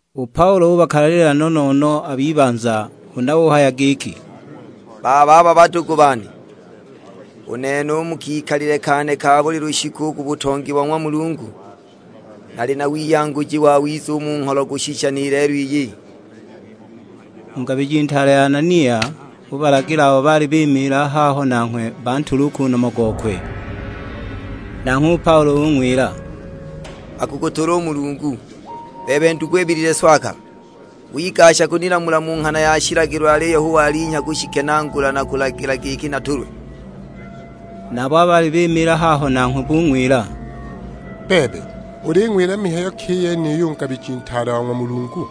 U Paulo ubakalalila no-no-no a b'ibanza; huna uhaya giki, "Bababa badugu bane, u nene u mu kikalile kane ka buli lushiku u ku butongi bo ng'wa Mulungu, nali na wiyanguji wawiza u mu ngholo kushisha ni lelo iyi." U ngabiji ntaale Anania ubalagila abo baali bimiila haho nanghwe bantule u ku nomo gokwe. Nanghwe u Paulo ung'wila, "Akukutula u Mulungu, bebe ndugu ibilile swakala; wigashaga kunilamula mu nghana ya shilagilo aliyo hu walinhya kushikenaagula na kulagila giki natulwe!" Nabo abo baali bimiila haho nanghwe bung'wila, "Bebe, uling'wila mihayo ki i yeniyo u ngabiji ntaale wa ng'wa Mulungu?"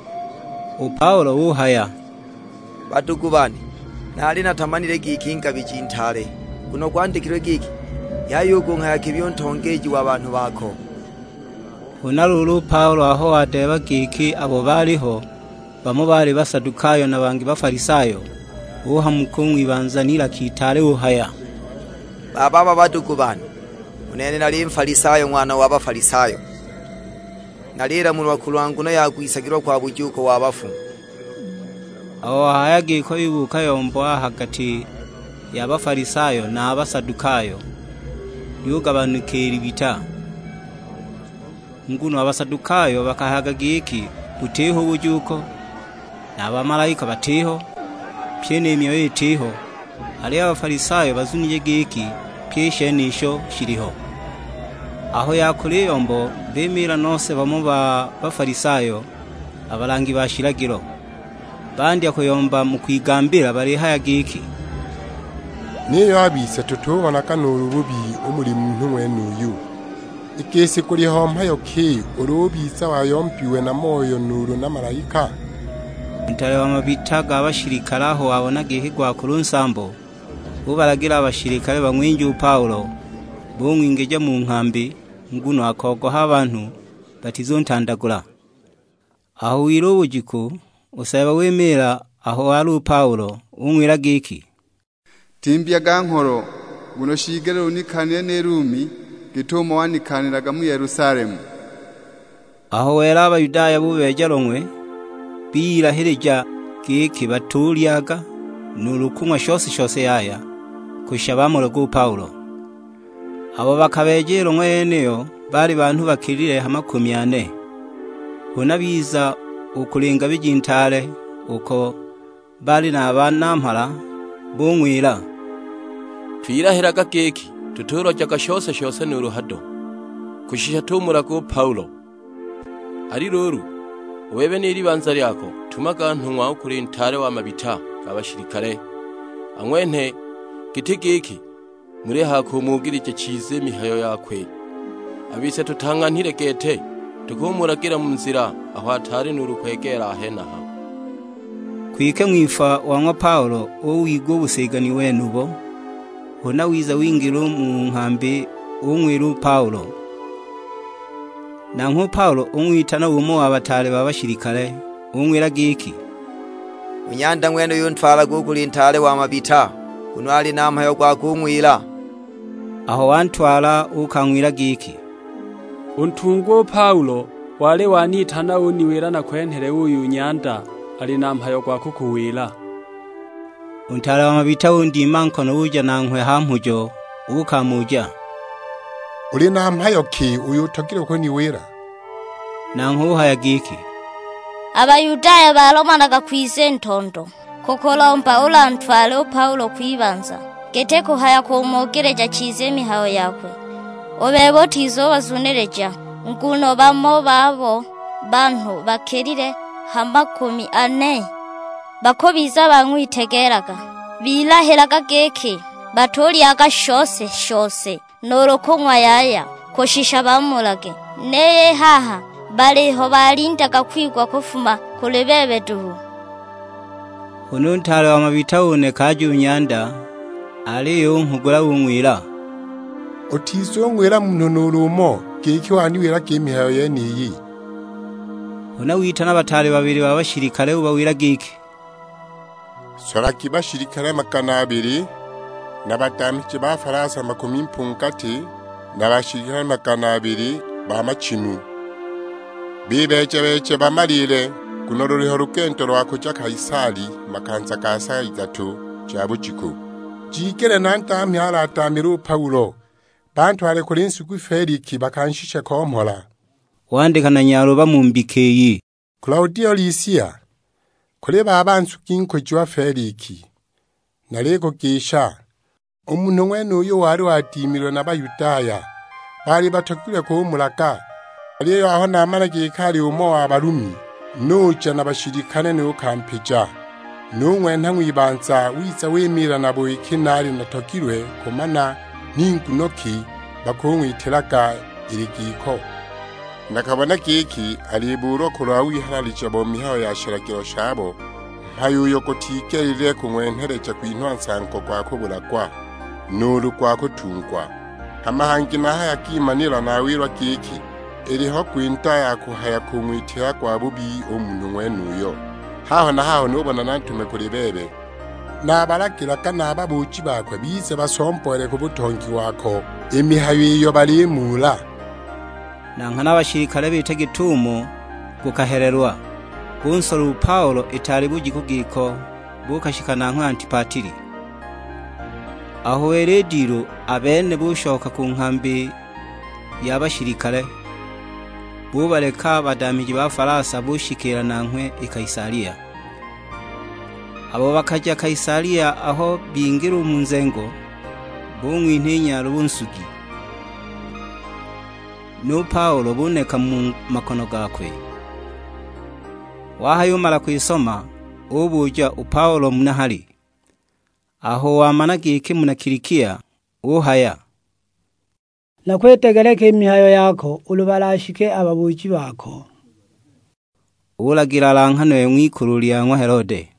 U Paulo uhaya, "Badugu bane, naali natamanile giki ngabiji ntaale, nguno gwandikilwe giki, 'Yaya u kunghaya kibi u ntongeeji wa banhu bako.' " Huna luulu u Paulo aho wadeeba giki abo baaliho, bamo baali Basadukayo na bangi Bafalisayo, uhamuka u ng'wibanza n'ilaka itaale uhaya, "Bababa badugu bane, u nene nali Nfalisayo, ng'wana wa Bafalisayo, nalilamulwa kulwa nguno ya kwisagilwa kwa bujuuko wa bafu!" Aho wahaya giko yubuuka yombo a ha gati ya Bafalisayo na a Basadukayo, lyugabanika i libita. Nguno a Basadukayo bakahayaga giki butiho u bujuuko, na a bamalaika batiho, pye ni myoyo itiho; aliyo a Bafalisayo bazunije giki pyi i shenisho, shiliho. Aho yakula i yombo, bimiila nose bamo ba Bafalisayo, a balangi ba shilagilo. Bandya kuyomba mu kwigambila balihaya giki, "Niyo a bise tutubonaga nuulu bubi u muli munhu ng'wenuyu. I gisi guliho mhayo ki ulu ubiza wayombiwe na moyo nuulu na malaika?" U ntaale wa mabita ga bashilikale aho wabona giki gwakula u nsambo, ubalagila a bashilikale bang'winje u Paulo; bung'wingija mu nghambi, nguno akogoha a banhu batizuntandagula. Aho wila u bujiku, u Seeba wimiila aho wali u Paulo; ung'wila giki, "Timbyaga ngholo, nguno shiigelile unikaaniile ni Lumi git'umo wanikaanilaga mu Yelusalemu." Aho wela a Bayudaya bubeeja long'we; biyilahija giki batulyaga nuulu kung'wa shose-shose yaya, kushisha bamulage u Paulo. Abo bakabeeja i long'we yeniyo baali banhu bakilile ha makumi ane. Huna biza u kuli ngabiji ntaale, uko baali na a banamhala; bung'wila, "Twilahilaga giki tutulojaga shose-shose nuulu hado, kushisha tumulage u Paulo. Ali luulu, u bebe ni libanza lyako tumaga nhung'wa u kuli ntaale wa mabita ga bashilikale, ang'wenhe; giti giki mulihaya kumugilija chiza i mihayo yakwe. A bise tutang'anhilile gete, tukumulagila mu nzila aho ataali nuulu kwegeela a henaha." Kwike ng'wipfwa wa ng'wa Paulo uwigwa u busigani wenubo, huna wiza wingila u mu nghambi, ung'wila u Paulo. Nanghwe u Paulo ung'witana umo wa bataale ba bashilikale; ung'wila giki, "U nyanda ng'wenuyu ntwalage u kuli ntaale wa mabita, nguno ali na mhayo gwa kung'wila." Aho wantwala uukang'wila giki, "U ntungwa u Paulo wali wanitana uniwila nakwenhele uyu nyanda ali na mhayo gwa kukuwila." U ntaale wa mabita undima nkono uja nanghwe ha mhujo uukamuja, "Uli na mhayo ki uyo utogilwe kuniwila?" Nanghwe uhaya giki, "A Bayudaya balomanaga kwiza i ntondo kukulomba ulantwale u Paulo kwibanza giti kuhaya kumugilija chiza i mihayo yakwe. U bebe utizubazunilija, nguno bamo babo, banhu bakilile ha makumi ane, bakubiza bang'witegeelaga. Bilahilaga giki batulyaga shose-shose nuulu kung'wa yaya, kushisha bamulage; niyo i haha baliho balindaga kwigwa kufuma kuli bebe duhu." Huna u ntaale wa mabita uneka aje u nyanda, aliyo unghugula ung'wila, "Utizung'wila munhu nuulu umo, giki waniwilaga i mihayo yeniyi." Huna witana bataale babili ba bashilikale ubawila giki, "Solagi bashilikale magana abili, na badamhiji ba falasa makumi mpungati, na bashilikale magana abili ba machimu; bibeeja-beeje bamaliile, nguno luliho lugendo lwa kuja Kaisalia makanza ga sa idatu ja bujiku. Jigele na ndamhi aladamhile u Paulo, bantwale kuli nsugi Feliki bakanshishe ko mhola." Wandika na nyaluba mu mbika iyi. "Kilaudio Lisia: kuli baba nsugi nkujiwa Feliki. Nalikugisha. U munhu ng'wenuyu wali wadimilwe na Bayudaya; baali batogilwe kumulaga, aliyo aho namana giki ali umo wa Balumi, nuja na bashilikale nukampija. Nung'wenha ng'wibanza, wiza wimiila nabo iki naali natogilwe kumana ni nguno ki bakung'witilaga ili giko. Nakabona giki alibuulwa kulwa wihalalija bo mihayo ya shilagilo shabo; mhayo uyo gutigelile kung'wenheleja kwinhwa nsango gwa kubulagwa, nuulu gwa kutungwa. Hama hangi nahayagimanila nawilwa giki, iliho gwinda ya kuhaya kung'witila gwabubi u munhu ng'wenuyo; haho na haho nubona nantume kuli bebe. Nabalagilaga na a babuuji bakwe bize basomboole ku butongi wako, i mihayo iyo balimuula." Na nghana a bashilikale biita git'umo gukahelelwa, bunsola u Paulo itaali bujiku giko, buukashika nanghwe Antipatili. Aho wela i dilu a bene bushoka ku nghambi ya bashilikale, bubaleka a badamhiji ba falasa bushikiila nanghwe i Kaisalia. Abo bakaja i Kaisalia aho bingila u mu nzengo, bung'winha i nyaluba u nsugi; nu Paulo buneka mu makono gakwe. Wahayumala kwisoma, ubuja u Paulo muna hali; aho wamana giki muna Kilikia, uhaya; "Nakwidegeleka i mihayo yako ulu balashike a babuuji bako." Ulagila alanghanwe ng'wikulu lya ng'wa Helode.